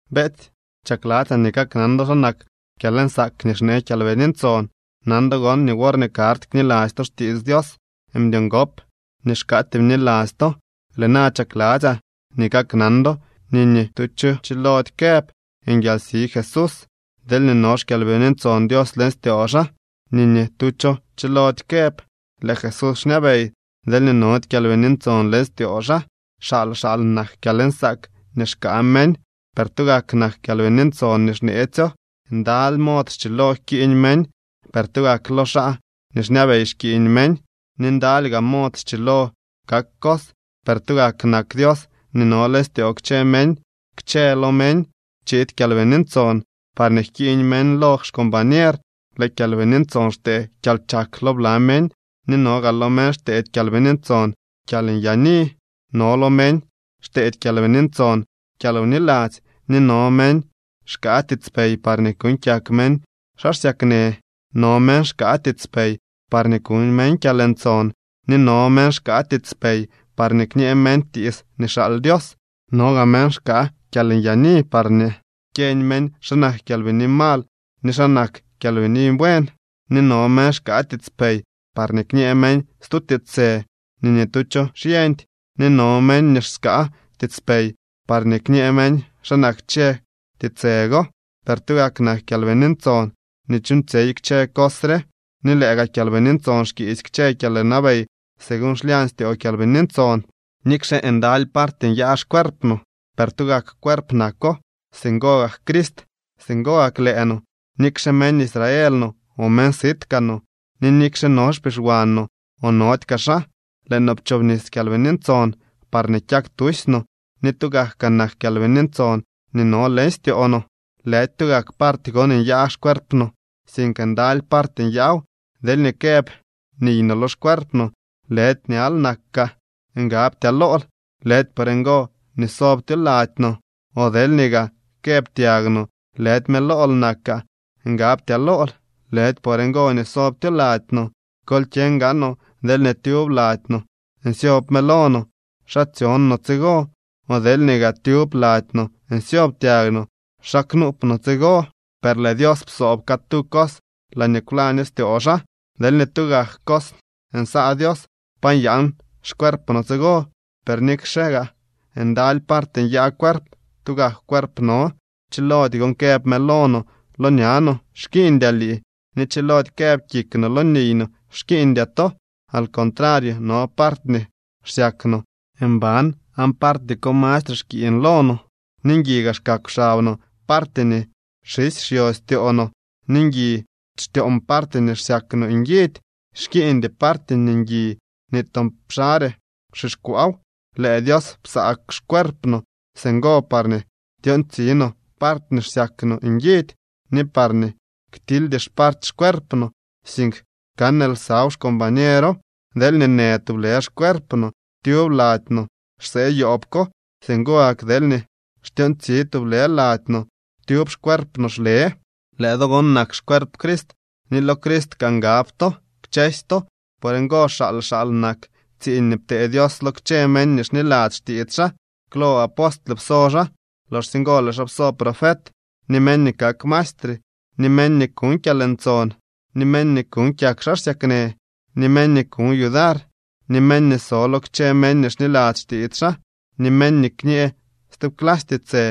Beetsy, chakladzyaa nii kaknan do xa nak kyalnsaak nii xnee Kyalbini Ntson. Nan do gon nii worñee karty kniladzy to xtiits Dios, mdyo ngop nii xkaatyee bniladzy to. Lëë na chakladzyaa nii kaknan do nii ni tu cho chilody këb: “¡Nguialsi Jesús!” deelñee no xKyalbini Ntson Dios leñ styoo xaa. Ni ni tu cho chiloody këb: “¡Lëë Jesús xñabey!” deelñee nody Kyalbini Ntson leñ styoo xaa. Xaal xaal nak kyalnsaak nii xkaa meñ, per tugak nak Kyalbini Ntson nii xneetsyo. Ndaly mod schilo jkiiñ meñ, per tugak lo xaa nii xñabey xkiiñ meñ. Ni ndaly gaa mod schilo kak cos, per tugak nak Dios nii no leñ styoo kchë meñ. Kchëlo meñ chiid Kyalbini Ntson parñee jkiiñ meñ lo xcombañer. Lëë Kyalbini Ntson xtee kyalchak lo bla meñ, ni no gaa lo meñ xteedy Kyalbini Ntson kyalnyaani. No lo meñ xteedy Kyalbini Ntson kyalwniladzy ni no meñ xkaa tiitspey parñee kuuñ kyak meñ xaa xsyaknë. No meñ xkaa tiitspey parñee kuñ meñ kyalntson, ni no meñ xkaa tiitspey parñee kñee meñ tiits nii xaal Dios. No gaa meñ xkaa kyalnyaani parñee kyeñ meñ xa nak kyalbini mal ni xa nak kyalbini buen, ni no meñ xkaa tiitspey parñee kñee meñ stu tiitsë nii ni tu cho xyeñdy, ni no meñ nii xkaa tiitspey parñee kñee meñ xa nak kchë tiitsë go. Per tugak nak Kyalbini Ntson nii chuuñtsyey kchë cos re, ni lëë gaa Kyalbini Ntson xkiisy kchë kyalwnabey según xlyañ styoo Kyalbini Ntson. Nikxe ndaly party nyaa xcuerp no, per tugak cuerp nako. Singo gak Crist. Singo gak lëë no, nikxe meñ Israel no o meñ sit kaa no, ni nikxe no xpixwaan no o nody kaa xaa, lëë no pchoobnis Kyalbini Ntson parñee kyak tusy no ni tugak kaa nak Kyalbini Ntson nii no leñ styoo no. Lëdy tugak party gon nyaa xcuerp no, sink ndaly party nyaaw. Deelñee këb niy no lo xcuerp no: “Lëdy ñal nakaa, ngabtyaa lool”, lëdy por ngo nii sobtyo lady no. O deelñee gaa këb tyag no: “Lëdy mëlool nakaa, ngabtyaa lool”, lëdy por ngo nii sobtyo lady no. Kol kyeñ gaanoo deelñee tyub lady no nsyob mëlo no, ¿xa tsyon no tsigo? O deelñee gaa tyub lady no nsyob tyag no, ¿xa knuup no cos tsigo? Per lëë Dios psoob catu cos laañee kwlaño styoo xaa. Deelñee tugak cos nsaa Dios, ¿pa nyaan xcuerp no tsigo? Per nikxe gaa ndaly party nyaa cuerp, tugak cuerp no. Chilody gon këb mëlo no lo ña no: “Xkiiñdyaa lii”, ni chilody këb kik no lo niy no: “Xkiiñdyaa to.” Al contrario no party nii xsyak no mban aan party ko mastre xkiiñ lo no. Ni ngui xkakw xab no party nii xisy xyo styoo no ni ngui xtyon party nii xsyak no nguidy Xkiiñdy party nii ngui nii toon xare xixkwaaw. Lëë Dios psaa xcuerp no singo parñee tyontsi no party nii xsyak no nguidy, ni parñee ktildy xparty xcuerp no, sink kan lsaw xcombañero. Deelñee në tublë xcuerp no, tyub lady no xsee yoob ko. Singo gak deelñee xtyoontsi tublë lady no, tyub xcuerp no xle. Lëë do gon nak xcuerp Crist, ni lo Crist kaa ngab to kchësy to. Por ngo xaal xaal nak tsiiñ nii ptee Dios lo kchë meñ nii xniladzy xtiits xaa. Klo apostle pso xaa. Loxsye ngo lëë xaa pso profet, ni meñ nii kak maestre, ni meñ nii kuñ kyalntson, ni meñ nii kuuñ kyak xaa xsyaknë, ni meñ nii kuñ yudar, ni meñ nii so lo kchë meñ nii xniladzy xtiits xaa, ni meñ nii kñee stub clasy tiitsë.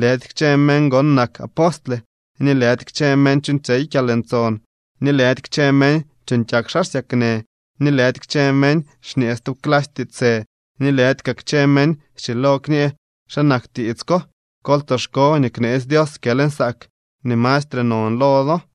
Lëdy kchë meñ gon nak apostle ni lëdy kchë meñ chuuñtsyey kyalntson, ni lëdy kchë meñ chuuñ kyak xaa xsyaknë ni lëdy kchë meñ xñee stub clasy tiitsë ni lëdy kaa kchë meñ schilo kñë xa nak tiits ko. Kol tsoxko nii kneetsy Dios kyalnsaak nii mastre non lo do.